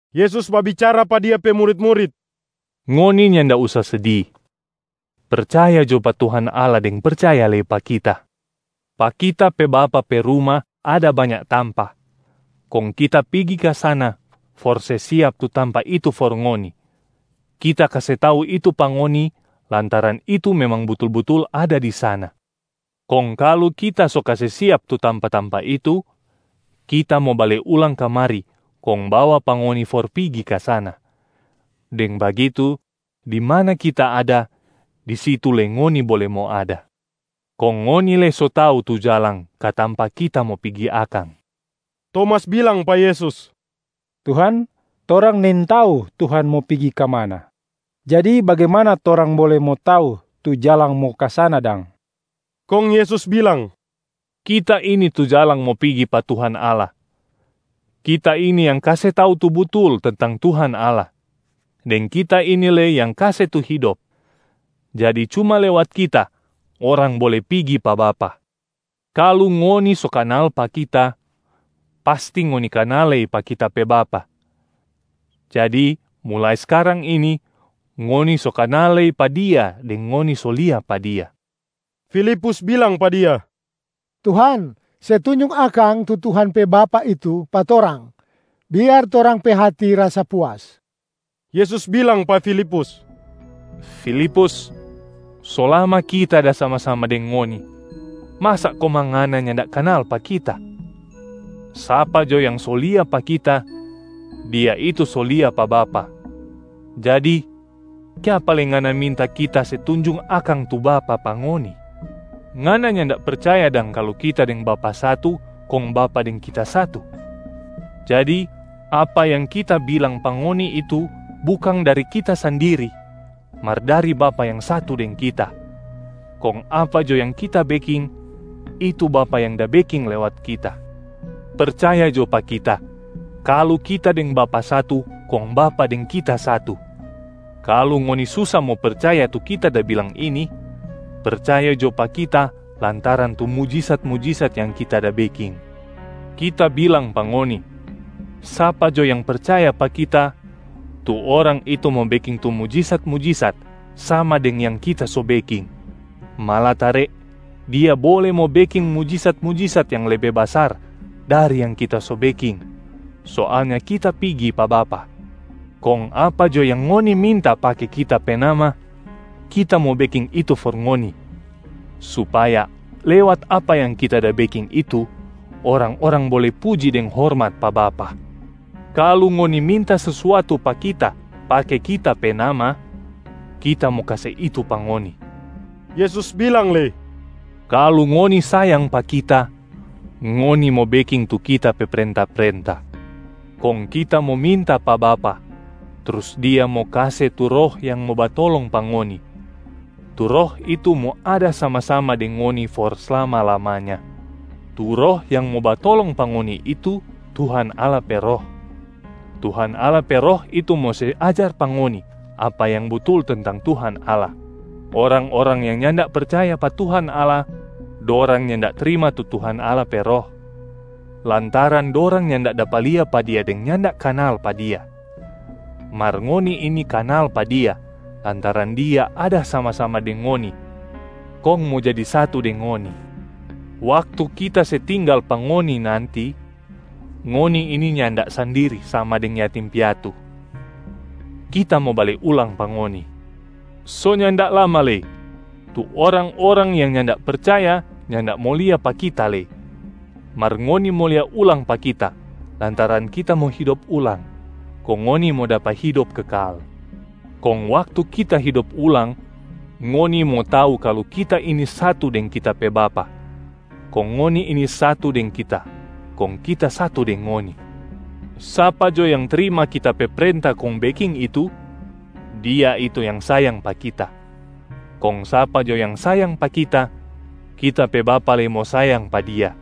Yesus babicara pa Dia pe murit-murit, “Ngoni nyanda usa sedi. Percaya jo pa Tuhan Allah deng percaya lei pa Kita. Pa Kita pe Bapa pe ruma ada banya tampa, kong Kita pigi ka sana for se siap tu tampa itu for ngoni. Kita kase tau itu pa ngoni lantaran itu memang butul-butul ada di sana. Kong kalu Kita so kase siap tu tampa-tampa itu, Kita mo bale ulang kamari kong bawa pa ngoni for pigi ka sana. Deng bagitu, di mana Kita ada, di situ lei ngoni bole mo ada. Kong ngoni lei so tau tu jalang ka tampa Kita mo pigi akang.” Tomas bilang pa Yesus, “Tuhan, torang nintau Tuhan mo pigi ka mana. Jadi bagimana torang bole mo tau tu jalang mo ka sana dang?” Kong Yesus bilang, “Kita ini tu jalang mo pigi pa Tuhan Allah, Kita ini yang kase tau tu butul tentang Tuhan Allah, deng Kita ini lei yang kase tu hidop. Jadi cuma lewat Kita, orang bole pigi pa Bapa. Kalu ngoni so kanal pa Kita, pasti ngoni kanal lei pa Kita pe Bapa. Jadi mulai skarang ini, ngoni so kanal lei pa Dia deng ngoni so lia pa Dia.” Filipus bilang pa Dia, “Tuhan, se tunjung akang tu Tuhan pe Bapa itu pa torang, biar torang pe hati rasa puas.” Yesus bilang pa Filipus, “Filipus, so lama Kita da sama-sama deng ngoni, masa komang ngana nyanda kanal pa Kita? Sapa jo yang so lia pa Kita, dia itu so lia pa Bapa. Jadi, kiapa lei ngana minta Kita se tunjung akang tu Bapa pa ngoni? Ngana nyanda percaya dang kalu Kita deng Bapa satu, kong Bapa deng Kita satu? Jadi, apa yang Kita bilang pa ngoni itu bukang dari Kita sandiri mar dari Bapa yang satu deng Kita. Kong apa jo yang Kita beking, itu Bapa yang da beking lewat Kita. Percaya jo pa Kita, kalu Kita deng Bapa satu kong Bapa deng Kita satu. Kalu ngoni susa mo percaya tu Kita da bilang ini, percaya jo pa Kita lantaran tu mujisat-mujisat yang Kita da beking. Kita bilang pa ngoni, sapa jo yang percaya pa Kita, tu orang itu mo beking tu mujisat-mujisat sama deng yang Kita so beking, malatare dia bole mo beking mujisat-mujisat yang lebe basar dari yang Kita so beking. Soalnya Kita pigi pa Bapa, kong apa jo yang ngoni minta pake Kita pe nama, Kita mo beking itu for ngoni, supaya lewat apa yang Kita da beking itu, orang-orang bole puji deng hormat pa Bapa. Kalu ngoni minta sesuatu pa Kita pake Kita pe nama, Kita mo kase itu pa ngoni.” Yesus bilang lei, “Kalu ngoni sayang pa Kita, ngoni mo beking tu Kita pe prenta-prenta. Kong Kita mo minta pa Bapa, trus Dia mo kase tu Roh yang mo batolong pa ngoni. Tu Roh itu mo ada sama-sama deng ngoni for slama-lamanya. Tu Roh yang mo batolong pa ngoni itu Tuhan Allah pe Roh. Tuhan Allah pe Roh itu mo se ajar pa ngoni apa yang butul tentang Tuhan Allah. Orang-orang yang nyanda percaya pa Tuhan Allah, dorang nyanda trima tu Tuhan Allah pe Roh, lantaran dorang nyanda dapa lia pa Dia deng nyanda kanal pa Dia. Mar ngoni ini kanal pa Dia lantaran Dia ada sama-sama deng ngoni kong mo jadi satu deng ngoni. Waktu Kita se tinggal pa ngoni nanti, ngoni ini nyanda sandiri sama deng yatim piatu. Kita mo bale ulang pa ngoni. So nyanda lama lei, tu orang-orang yang nyanda percaya nyanda mo lia pa Kita lei. Mar ngoni mo lia ulang pa Kita lantaran Kita mo hidop ulang, kong ngoni mo dapa hidop kekal. Kong waktu Kita hidop ulang, ngoni mo tau kalu Kita ini satu deng Kita pe Bapa, kong ngoni ini satu deng Kita kong Kita satu deng ngoni. Sapa jo yang trima Kita pe prenta kong beking itu, dia itu yang sayang pa Kita. Kong sapa jo yang sayang pa Kita, Kita pe Bapa lei mo sayang pa dia,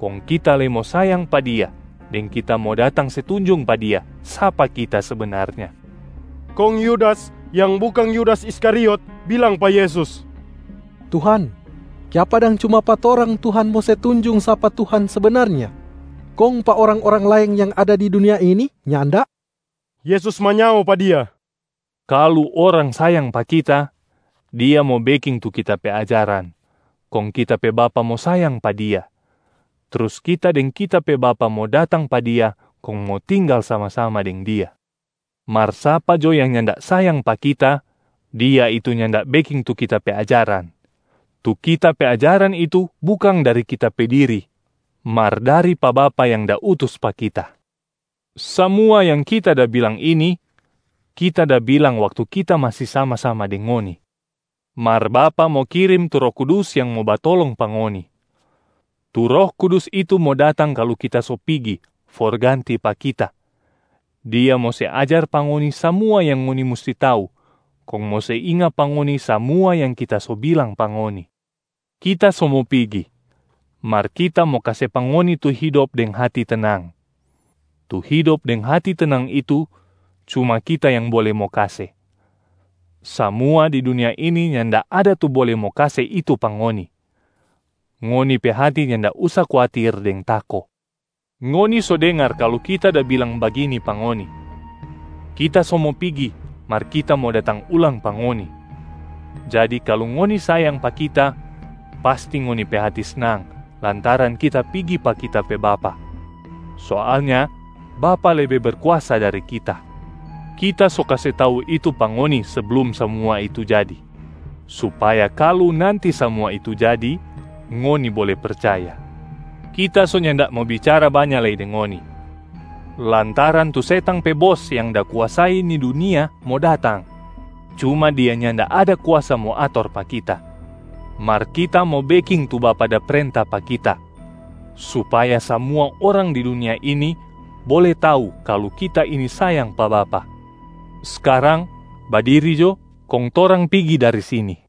kong Kita lei mo sayang pa dia deng Kita mo datang se tunjung pa dia sapa Kita sebenarnya.” Kong Yudas yang bukang Yudas Iskariot bilang pa Yesus, “Tuhan, kiapa dang cuma pa torang Tuhan mo se tunjung sapa Tuhan sebenarnya, kong pa orang-orang laeng yang ada di dunia ini nyanda?” Yesus manyao pa dia, “Kalu orang sayang pa Kita, dia mo beking tu Kita pe ajaran, kong Kita pe Bapa mo sayang pa dia, trus Kita deng Kita pe Bapa mo datang pa dia kong mo tinggal sama-sama deng dia. Mar sapa jo yang nyanda sayang pa Kita, dia itu nyanda beking tu Kita pe ajaran. Tu Kita pe ajaran itu bukang dari Kita pe diri, mar dari pa Bapa yang da utus pa Kita. Samua yang Kita da bilang ini, Kita da bilang waktu Kita masi sama-sama deng ngoni. Mar Bapa mo kirim tu Roh Kudus yang mo batolong pa ngoni. Tu Roh Kudus itu mo datang kalu Kita so pigi for ganti pa Kita, Dia mo se ajar pa ngoni samua yang ngoni musti tau kong mo se inga pa ngoni samua yang Kita so bilang pa ngoni. Kita so mo pigi, mar Kita mo kase pa ngoni tu hidop deng hati tenang. Tu hidop deng hati tenang itu, cuma Kita yang bole mo kase, samua di dunia ini nyanda ada tu bole mo kase itu pa ngoni. Ngoni pe hati nyanda usa kuatir deng tako. Ngoni so dengar kalu Kita da bilang bagini pa ngoni: Kita so mo pigi, mar Kita mo datang ulang pa ngoni. Jadi kalu ngoni sayang pa Kita, pasti ngoni pe hati snang lantaran Kita pigi pa Kita pe Bapa. Soalnya Bapa lebe berkuasa dari Kita. Kita so kase tau itu pa ngoni seblum samua itu jadi, supaya kalu nanti samua itu jadi, ngoni bole percaya. Kita so nyanda mo bicara banya lei deng ngoni, lantaran tu setang pe bos yang da kuasai ni dunia mo datang, cuma dia nyanda ada kuasa mo ator pa Kita. Mar Kita mo beking tu Bapa da prenta pa Kita supaya samua orang di dunia ini bole tau kalu Kita ini sayang pa Bapa. Skarang badiri jo kong torang pigi dari sini.”